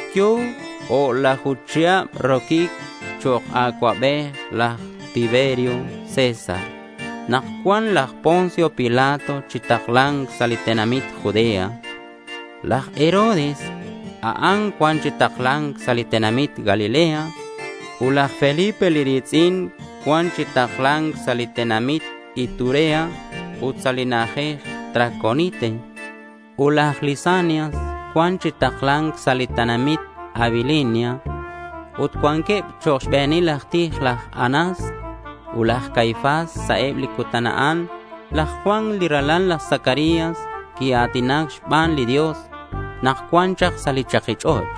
Yo̱ o'laju chihab roquic chok' acuabej laj Tiberio César, nak cua̱nk laj Poncio Pilato chi takla̱nc sa' li tenamit Judea. Laj Herodes a'an cua̱nk chi takla̱nc sa' li tenamit Galilea. Ut laj Felipe li ri̱tz'in cua̱nk chi takla̱nc sa' li tenamit Iturea ut sa' li na'ajej Traconite, ut laj Lisanias cua̱nk chi takla̱nc sa' li tenamit Abilinia. Ut cuanqueb chok' xbe̱nil aj tij laj Anás ut laj Caifás. Sa' eb li cutan a'an laj Juan li ralal laj Zacarías quia̱tina̱c xban li Dios nak cuan chak sa' li chaki ch'och'.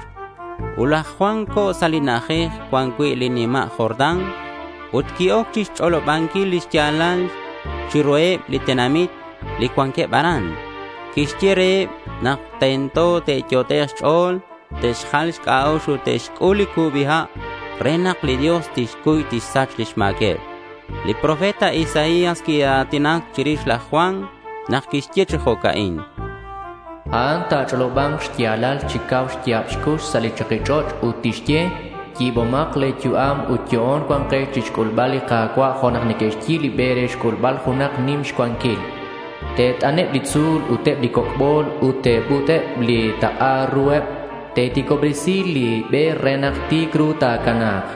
Laj Juan co̱ sa' li na'ajej cuan cui' li nima' Jordán ut qui-oc chixch'olobanquil li xya̱lal chiruheb li tenamit li cuanqueb aran. Quixye reheb nak tento te'yot'ek' xch'o̱l te'xjal xc'a'ux ut te'xc'ul li cubi ha' re nak li Dios tixcuy tixsach lix ma̱queb. Li profeta Isaías quia̱tinac chirix laj Juan nak quixye chi jo'ca'in: A'an ta̱ch'oloba̱nk xya̱lal chi cau xya̱b xcux sa' li chaki ch'och' ut tixye: Yi̱bomak le̱ yu'am ut yo'on cua̱nkex chixc'ulbal li Ka̱cua' jo' nak neque'xyi̱b li be re xc'ulbal junak nim xcuanquil. Te't'anek' li tzu̱l ut eb li coc' bol ut te'but'ek' eb li tak'a ruheb. Ta̱ti̱cobresi̱k li be re nak ti̱c ru ta̱cana̱k.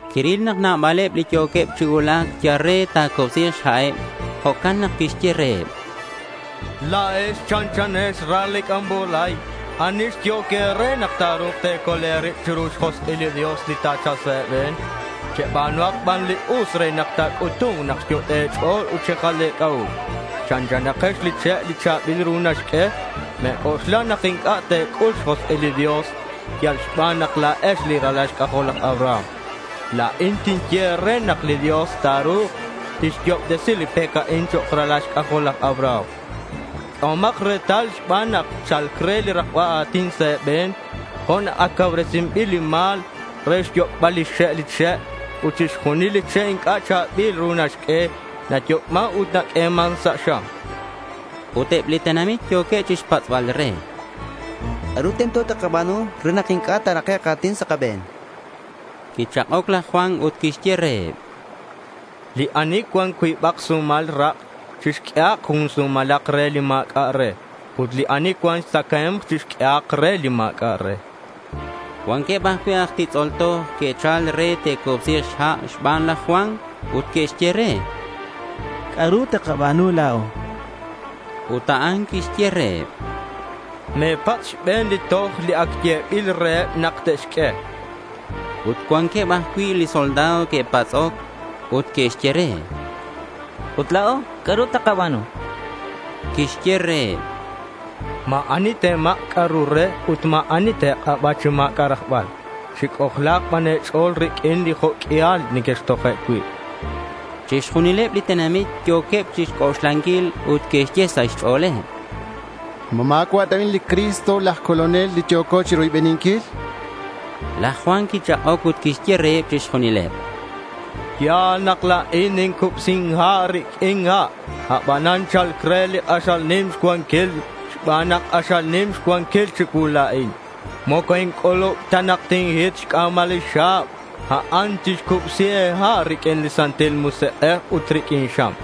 Quiril nak nabaleb li yo̱queb chi cuulac yal re ta̱cubsi̱k xha'eb. Jo'can nak quixye reheb: —La̱ex chanchanex li ral li c'ambolay. ¿Ani xyehoc e̱re nak ta̱ru̱k te̱col e̱rib chiru lix josk'il li Dios li ta̱cha̱lk sa' e̱be̱n? Cheba̱nuhak ban li us re nak ta̱c'utu̱nk nak xyot'e' e̱ch'o̱l ut xejal e̱c'a'ux. Chanchanakex li che' cha̱bil li ru naxq'ue. Me̱c'oxla nak inc'a' te̱c'ul xjosk'il li Dios yal xban nak la̱ex li ralal xc'ajol laj Abraham. La̱in tinye e̱re nak li Dios ta̱ru̱k tixyo'obtesi li pec a'in chok' ralal xc'ajol laj Abraham. Q'uehomak retal xban nak cha̱lc re li rakba a̱tin sa' e̱be̱n jo' nak ac cauresinbil li ma̱l re xyoc'bal lix xe' li che'. Ut chixjunil li che' inc'a' cha̱bil li ru naxq'ue, nayoc'man ut naq'ueman sa' xam, chan laj Juan. Ut eb li tenamit yo̱queb chixpatz'bal re: —¿C'a'ru tento takaba̱nu re nak inc'a' ta̱rakek' a̱tin sa' kabe̱n? chanqueb. Quichak'oc laj Juan ut quixye reheb: —Li ani cuan cuibak sumal rak' chixq'uehak jun sumalak re li ma̱c'a' re. Ut li ani cuan xtzacae̱mk, chixq'uehak re li ma̱c'a' re, chan. Cuanqueb ajcui' aj titz'ol toj que'chal re te'cubsi̱k xha' xban laj Juan ut que'xye re: —¿C'a'ru takaba̱nu la̱o? chanqueb. Ut a'an quixye reheb: —Me̱patz' xbe̱n li toj li ac yebil reheb nak te'xq'ue, chan. Ut cuanqueb ajcui' soldado que'patz'oc ut que'xye re: —Ut la̱o, ¿c'a'ru takaba̱nu? chanqueb. Quixye reheb: —Ma̱ ani te̱mak' c'a'ru re ut ma̱ ani te̱k'aba chi ma̱c'a' rajbal. Chic'ojla̱k ban e̱ch'o̱l riq'uin li jo' q'uial nequextoje' cui', chan. Chixjunileb li tenamit yo̱queb chixc'oxlanquil ut que'xye sa' xch'o̱leb: —¿Ma ma̱cua' ta cui' a'an li Cristo, laj Colonel li yo̱co chiroybeninquil? chanqueb. Laj Juan quichak'oc ut quixye reheb chixjunileb: —Ya̱l nak la̱in nincubsin ha' riq'uin ha'. Abanan cha̱lc re li k'axal nim xcuanquil. Xban nak k'axal nim xcuanquil chicuu la̱in, moco inc'ulub ta nak tinhit xc'a̱mal lix xa̱b. A'an tixcubsi e̱ha' riq'uin li Santil Musik'ej ut riq'uin xam.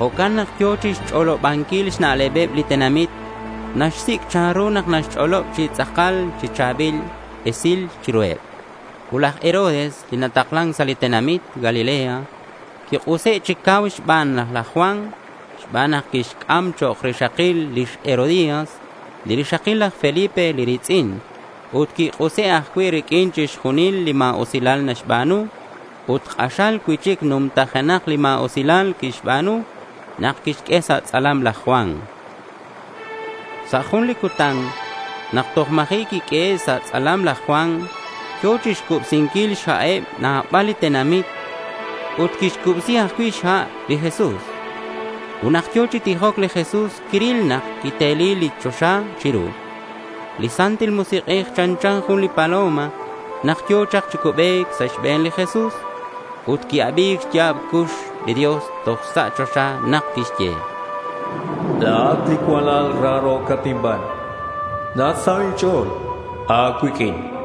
Jo'can nak yo̱ chixch'olobanquil xna'lebeb li tenamit. Naxsic' chanru nak naxch'olob chi tz'akal li cha̱bil esilal chiruheb. Ut laj Herodes, li nataklan sa' li tenamit Galilea, quik'use' chi cau xban laj Juan xban nak quixc'am chok' rixakil lix Herodías, li rixakil laj Felipe li ri̱tz'in. Ut quik'use' ajcui' riq'uin chixjunil li ma̱usilal naxba̱nu. Ut k'axal cui'chic numtajenak li ma̱usilal quixba̱nu nak quixq'ue sa' tz'alam laj Juan. Sa' jun li cutan nak toj ma̱ji' quiq'uehe' sa' tz'alam laj Juan, yo̱ chixcubsinquil xha'eb nabal li tenamit, ut quixcubsi ajcui' xha' li Jesús. Ut nak yo̱ chi tijoc li Jesús, quiril nak quiteli li choxa chiru. Li Santil Musik'ej chanchan jun li paloma nak yo̱ chak chi cubec sa' xbe̱n li Jesús ut qui-abi̱c xya̱b xcux li Dios toj sa' choxa nak quixye: —La̱at li cualal raro̱cat inban. Nasaho' inch'o̱l a̱cuiq'uin, chan.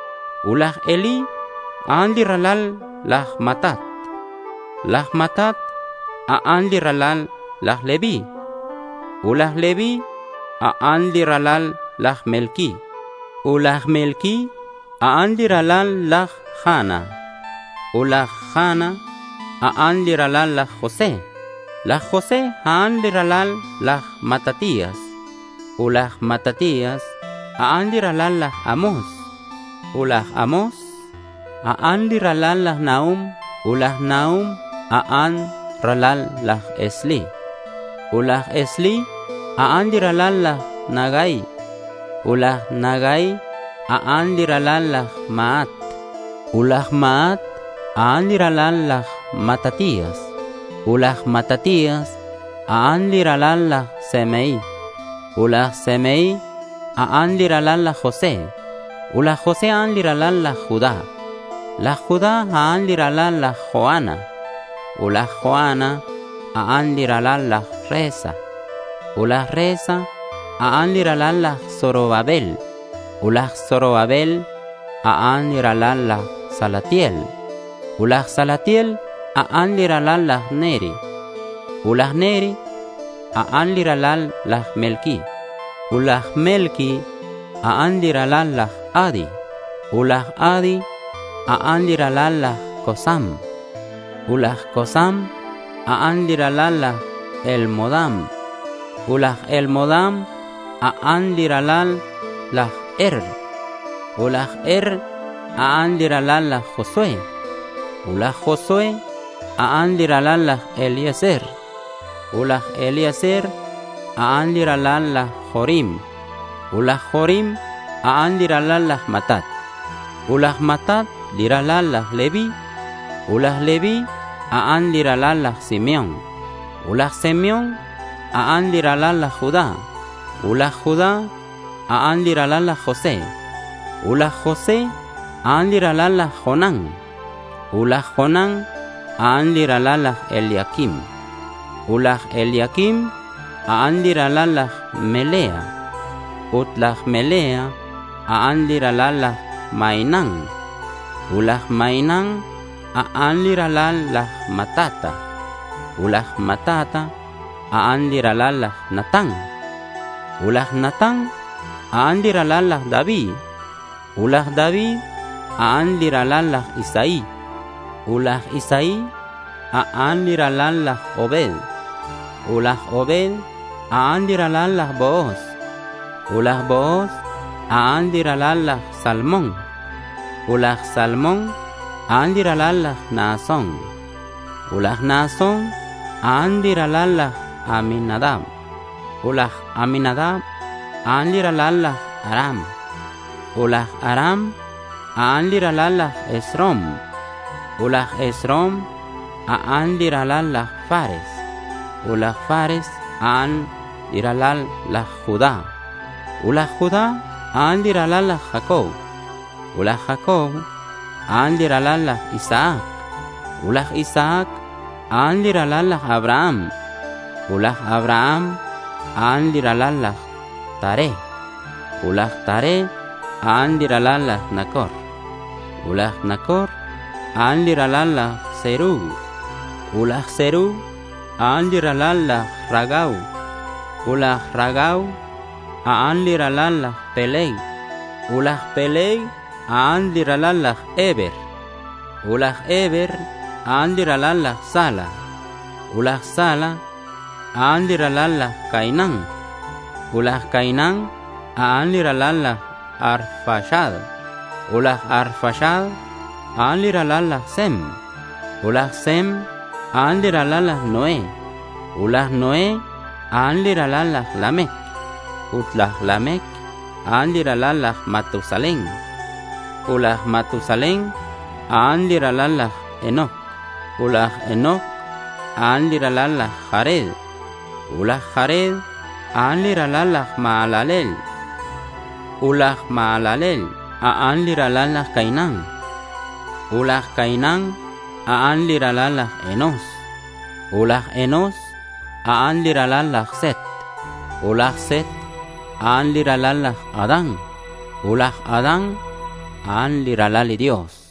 Ut laj Elí, a'an li ralal laj Matat. Laj Matat, a'an li ralal laj Leví. Ut laj Leví, a'an li ralal laj Melqui. Ut laj Melqui, a'an li ralal laj Jana. Ut laj Jana, a'an li ralal laj José. Laj José, a'an li ralal laj Matatías. Ut laj Matatías, a'an li ralal laj Amós. Ut laj Amós, a'an li ralal laj Nahum. Ut laj Nahum, a'an li ralal laj Esli. Ut laj Esli, a'an li ralal laj Nagai. Ut laj Nagai, a'an li ralal laj Maat. Ut laj Maat, a'an li ralal laj Matatías. Ut laj Matatías, a'an li ralal laj Semei. Ut laj Semei, a'an li ralal laj José. Ut laj José, a'an li ralal laj Judá. Laj Judá, a'an li ralal laj Joana. Ut laj Joana, a'an li ralal laj Resa. Ut laj Resa, a'an li ralal laj Zorobabel. Ut laj Zorobabel, a'an li ralal laj Salatiel. Ut laj Salatiel, a'an li ralal laj Neri. Ut laj Neri, a'an li ralal laj Melqui. Ut laj Melqui, a'an li ralal laj Adi. Ut laj Adi, a'an li ralal laj Cosam. Ut laj Cosam, a'an li ralal laj Elmodam. Ut laj Elmodam, a'an li ralal laj Er. Ut laj Er, a'an li ralal laj Josué. Ut laj Josué, a'an li ralal laj Eliezer. Ut laj Eliezer, a'an li ralal laj Jorim. Ut laj Jorim, a'an li ralal laj Matat. Ut laj Matat, a'an li ralal laj Leví. Ut laj Leví, a'an li ralal laj Simeón. Ut laj Simeón, a'an li ralal laj Judá. Ut laj Judá, a'an li ralal laj José. Ut laj José, a'an li ralal laj Jonán. Ut laj Jonán, a'an li ralal laj Eliaquim. Ut laj Eliaquim, a'an li ralal laj Melea. Ut laj Melea, a'an li ralal laj Mainán. Ut laj Mainán, a'an li ralal laj Matata. Ut laj Matata, a'an li ralal laj Natán. Ut laj Natán, a'an li ralal laj David. Ut laj David, a'an li ralal laj Isaí. Ut laj Isaí, a'an li ralal laj Obed. Ut laj Obed, a'an li ralal laj Booz. Ut laj Booz, a'an li ralal laj Salmón. Ut laj Salmón, a'an li ralal laj Naasón. Ut laj Naasón, a'an li ralal laj Aminadab. Ut laj Aminadab, a'an li ralal laj Aram. Ut laj Aram, a'an li ralal laj Esrom. Ut laj Esrom, a'an li ralal laj Fares. Ut laj Fares, a'an li ralal laj Judá. Ut laj Judá, a'an li ralal laj Jacob. Ut laj Jacob, a'an li ralal laj Isaac. Ut laj Isaac, a'an li ralal laj Abraham. Ut laj Abraham, a'an li ralal laj Taré. Ut laj Taré, a'an li ralal laj Nacor. Ut laj Nacor, a'an li ralal laj Serug. Ut laj Serug, a'an li ralal laj Ragau. Ut laj Ragau, a'an li ralal laj Peleg. Ut laj Peleg, a'an li ralal laj Heber. Ut laj Heber, a'an li ralal laj Sala. Ut laj Sala, a'an li ralal laj Cainán. Ut laj Cainán, a'an li ralal laj Arfaxad. Ut laj Arfaxad, a'an li ralal laj Sem. Ut laj Sem, a'an li ralal laj Noé. Ut laj Noé, a'an li ralal laj Lamec. Ut laj Lamec, a'an li ralal laj Matusalén. Ut laj Matusalén, a'an li ralal laj Enoc. Ut laj Enoc, a'an li ralal laj Jared. Ut laj Jared, a'an li ralal laj Mahalaleel. Ut laj Mahalaleel, a'an li ralal laj Cainán. Ut laj Cainán, a'an li ralal laj Enós. Ut laj Enós, a'an li ralal laj Set. Ut laj Set, a'an li ralal laj Adán. Ut laj Adán, a'an li ralal li Dios.